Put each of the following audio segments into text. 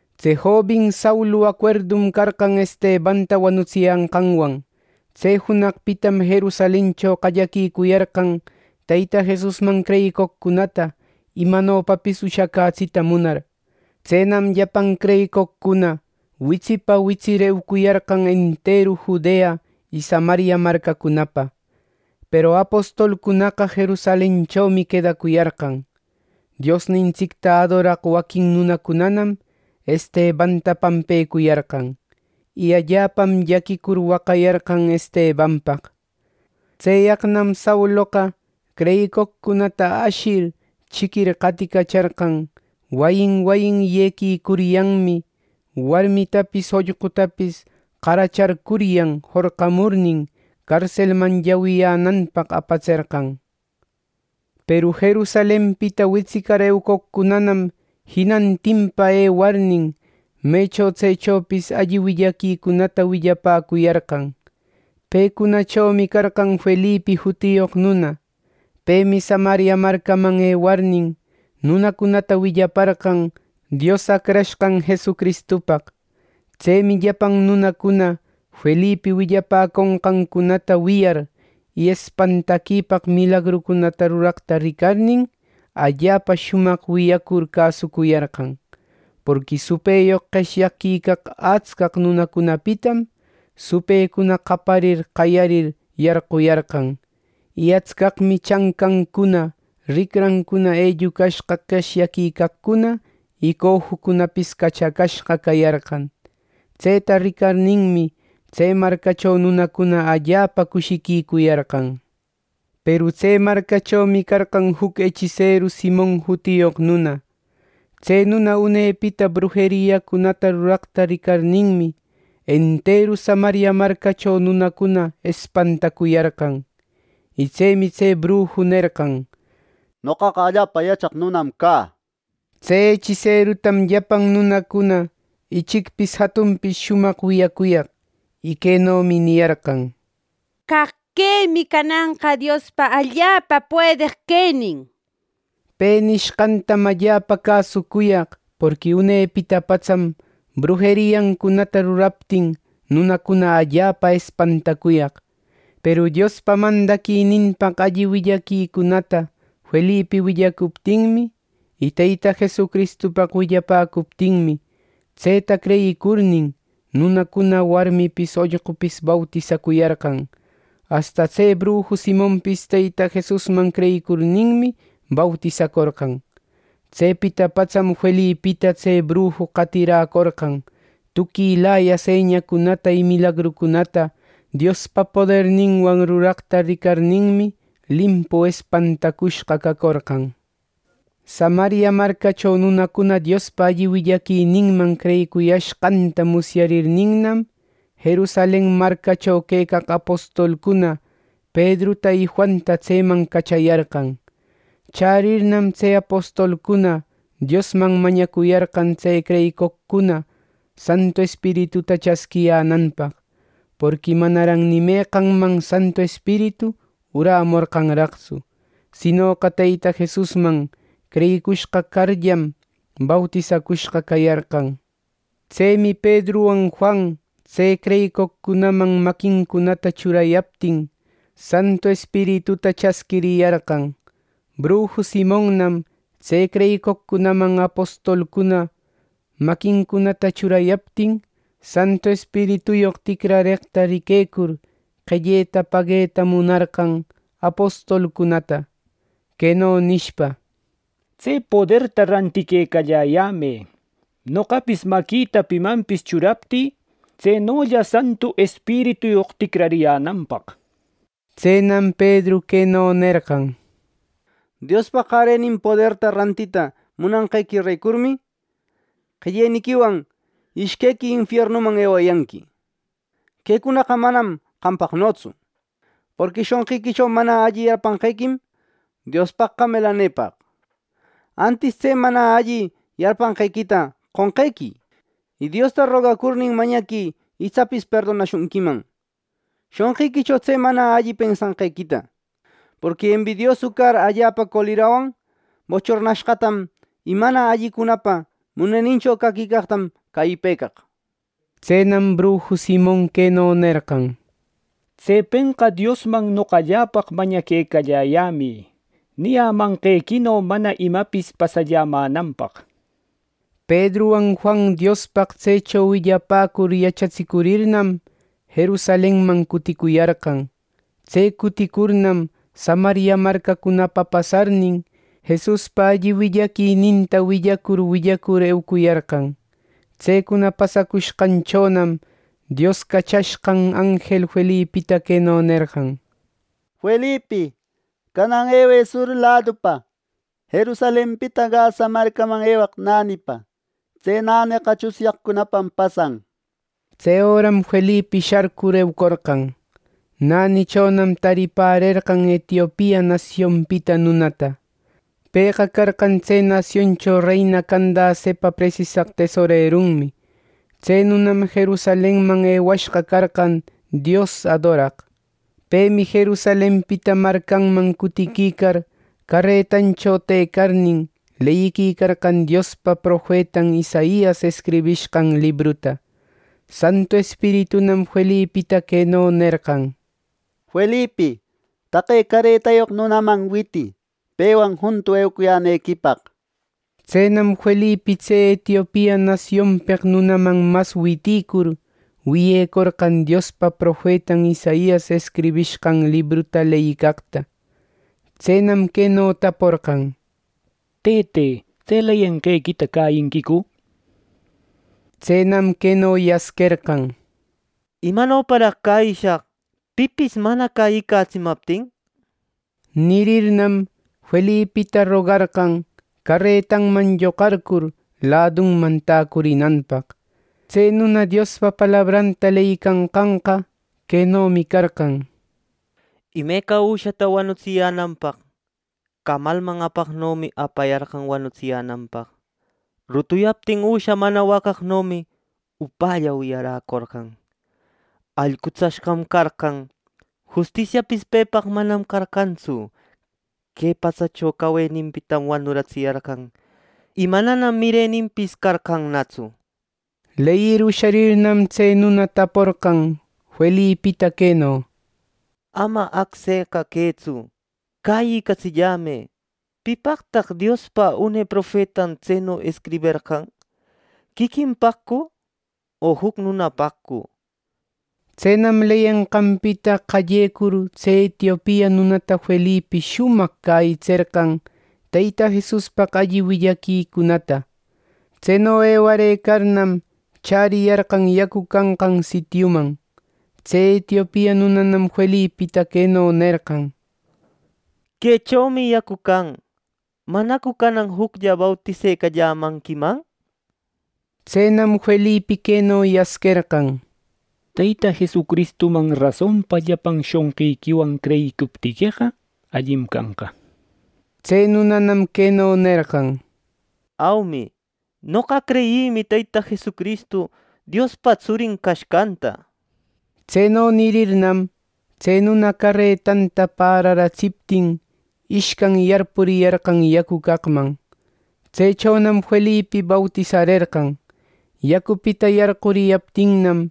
Tse jobin Saulu acuerdum carqan Estebanta wanutsiyanqanwan. Tse junaqpitam Jerusalencho qallaquicuyarqan Teyta Jesusman creyicoqcunata, imanopapis ushacätsita munar. Tsenam llapan creyicoqcuna witsipa witsir, eucuyarqan enteru Judea y Samaria marcacunapa; peru apostolcunaqa Jerusalenchomi quedacuyarqan. Diosnintsicta adoraq waquin nunacunanam Estebanta pampecuyarqan; y allapam llaquicur, waqayarqan Estebanpaq. Tseyaqnam Sauloqa creyicoqcunata ashir chiquir qaticacharqan, wayin wayin yequicuryanmi, warmitapis ollqutapis qaracharcuryan jorqamurnin, carselman llawiyänanpaq apatserqan. Peru Jerusalenpita witsicar eucoqcunanam jinantinpa ewarnin, mecho tsechopis alli willaquicunata willapäcuyarqan. Pecunachomi carqan Felipi jutiyoq nuna. Pemi Samaria marcaman ewarnin, nunacunata willaparqan Dios Acrashqan Jesucristupaq. Tsemi llapan nunacuna Felipi willapäconqancunata wiyar, y espantaquipaq milagrucunata ruraqta ricarnin, allapa shumaq wiyacur cäsucuyarqan. Porqui supëyoq qeshyaquicaq atscaq nunacunapitam supëcuna qaparir qayarir yarquyarqan. Y atscaqmi chancancuna ricrancuna ellucashqa qeshyaquicaqcuna y cojucunapis cachacashqa cayarqan. Tseta ricarninmi, tse marcacho nunacuna allapa cushicuyarqan. Peru tse marcachomi carqan juc echiseru Simon jutiyoq nuna. Tse nuna unepita brujeriacunata ruraqta ricarninmi, enteru Samaria marcacho nunacuna espantacuyarqan. Y tsemi tse bruju nerqan: —Noqaqa allapa yachaq nunam cä —nishpa. Tse echiserutam llapan nunacuna ichicpis jatunpis shumaq wiyacuyaq; y quenomi niyarqan: —¡Caq quemi cananqa Diospa allapa puedeq quenin! —nishpa. Pe nishqantam allapa cäsucuyaq porqui unepita patsam, brujeriancunata ruraptin, nunacuna allapa espantacuyaq. Peru Diospa mandaquininpaq alli willaquicunata Felipi willacuptinmi, y Teyta Jesucristupaq willapäcuptinmi, tseta creyicurnin, nunacuna warmipis ollqupis bautisacuyarqan. Asta tse bruju Simonpis Teyta Jesusman creyicurninmi, bautisacorqan. Tsepita patsam Felipita tse bruju qatiräcorqan. Tuquilaya señacunata y milagrucunata Diospa poderninwan ruraqta ricarninmi, limpu espantacushqa cacorqan. Samaria marcacho nunacuna Diospa alli willaquininman creyicuyashqanta musyarirninnam, Jerusalen marcacho quecaq apostolcuna Pedruta y Juanta tseman cachayarqan. Chärirnam, tse apostolcuna Diosman mañacuyarqan tse creyicoqcuna Santu Espirituta chasquiyänanpaq. Porqui manaran ni meqanman Santu Espiritu urämorqanraqtsu; sinoqa Teyta Jesusman creyicushqa carllam, bautisacushqa cayarqan. Tsemi Pedruwan Juan tse creyicoqcunaman maquincunata churayaptin, Santu Espirituta chasquiriyarqan. Bruju Simonnam tse creyicoqcunaman apostolcuna maquincunata churayaptin, Santu Espirituyoq ticrareqta riquecur, qelleta pagueta munarqan apostolcunata, queno nishpa: —Tse poderta rantiquecalläyämë, noqapis maquïta pimanpis churaptï, tsenolla Santu Espirituyoq ticrariyänanpaq. Tsenam Pedru queno nerqan: —Diospa qarenin poderta rantita munanqequirecurmi, qelleniquiwan ishquequi infiernuman ewayanqui. Quecunaqa manam qampaqnotsu. Porqui shonqiquicho mana alli yarpanqequim, Diospaqqa melanepaq. Antis tse mana alli yarpanqequita qonqequï; y Diosta rogacurnin, mañaquï itsapis perdonecushunquiman shonqiquicho tse mana alli pensanqequita. Porqui embidiosu car allapa colerawan bochornashqatam y mana allicunapa munenincho caquicaqtam cäyipëcaq —nishpa. Tsenam bruju Simon queno nerqan: —Tsepenqa Diosman noqalläpaq mañaquecalläyämï, niyämanqequino mana imapis pasallämänanpaq —nishpa. Pedruwan Juan Diospaq tsecho willapäcur yachatsicurirnam, Jerusalenman cuticuyarqan. Tse cuticurnam Samaria marcacunapa pasarnin, Jesuspa alli willaquininta willacur willacur eucuyarqan. Tsecuna pasacushqanchonam Dios cachashqan anjel Felipita queno nerqan: —Felipi, canan ewë sur ladupa, Jerusalenpita Gaza marcaman ewaq nänipa. Tse näneqa tsunyaqcunapam pasan. Tse öram Felipi sharcur eucorqan; nänichonam taripärerqan Etiopia nasionpita nunata. Pëqa carqan tse nasioncho reina Candacepa presisaq tesorerunmi. Tse nunam Jerusalenman ewashqa carqan Dios adoraq. Pemi Jerusalenpita marcanman cutiquicar caretancho tëcarnin, leyicarqan Diospa profetan Isaias escribishqan libruta. Santu Espiritunam Felipita queno nerqan: —Felipi, taqe caretayoq nunaman witï, pewan juntu eucuyänequipaq —nishpa. Tsenam Felipi tse Etiopia nasionpeq nunaman mas witïcur, wiyecorqan Diospa profetan Isaias escribishqan libruta leyicaqta. Tsenam queno taporqan: —Tëte, ¿tse leyenqequita cäyinquicu? —nishpa. Tsenam queno yasquerqan: —¿Imanoparaq cäyishaq, pipis mana cäyicatsimaptin! —nishpa. Nirirnam, Felipita rogarqan, caretanman lloqarcur, ladunman täcurinanpaq. Tse nuna Diospa palabranta leyicanqanqa quenomi carqan: “Imeca üshata wanutsiyänanpaq, camalman apaqnomi apayarqan wanutsiyänanpaq. Rutuyaptin üsha mana waqaqnomi, upälla wiyaräcorqan. Allqutsashqam carqan; justisiapis pepaqqa manam carqantsu. Que patsacho caweninpitam wanuratsiyarqan; y mananam mireninpis carqannatsu.” Leyir usharirnam, tse nuna taporqan Felipita queno: —Ama acseqa quëtsu, cäyicatsillämë. ¿Pipaqtaq Diospa une profetan tseno escriberqan? ¿Quiquinpaqcu, o juc nunapaqcu? —nishpa. Tsenam leyenqanpita qallecur tse Etiopia nunata Felipi shumaq cäyitserqan Teyta Jesuspaq alli willaquicunata. Tseno ewarëcarnam, chäriyarqan yacu canqan sitiuman. Tse Etiopia nunanam Felipita queno nerqan: —Quechomi yacu can. ¿Manacu canan juclla bautisecallämanquiman? —nishpa. ˻Tsenam Felipi queno yasquerqan: —Teyta Jesucristuman rasonpa llapan shonqiquiwan creyicuptiqueqa, allim canqa —nir. Tse nunanam queno nerqan: —Aumi, noqa creyïmi Teyta Jesucristu Diospa tsurin cashqanta —nir.˼ Tseno nirirnam, tse nuna caretanta päraratsiptin, ishcan yarpuriyarqan yacu caqman. Tsechonam Felipi bautisarerqan. Yacupita yarquriyaptinnam,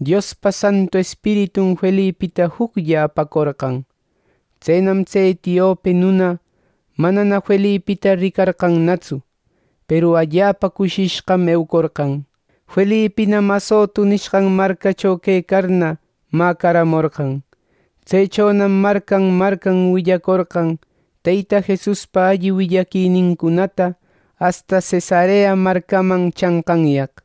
Diospa Santu Espiritun Felipita juclla apacorqan. Tsenam tse etiope nuna manana Felipita ricarqannatsu; peru allapa cushishqam eucorqan. Felipinam Azoto nishqan marcacho quecarna, mäcaramorqan. Tsechonam marcan marcan willacorqan Teyta Jesuspa alli willaquinincunata asta Cesarea marcaman chanqanyaq.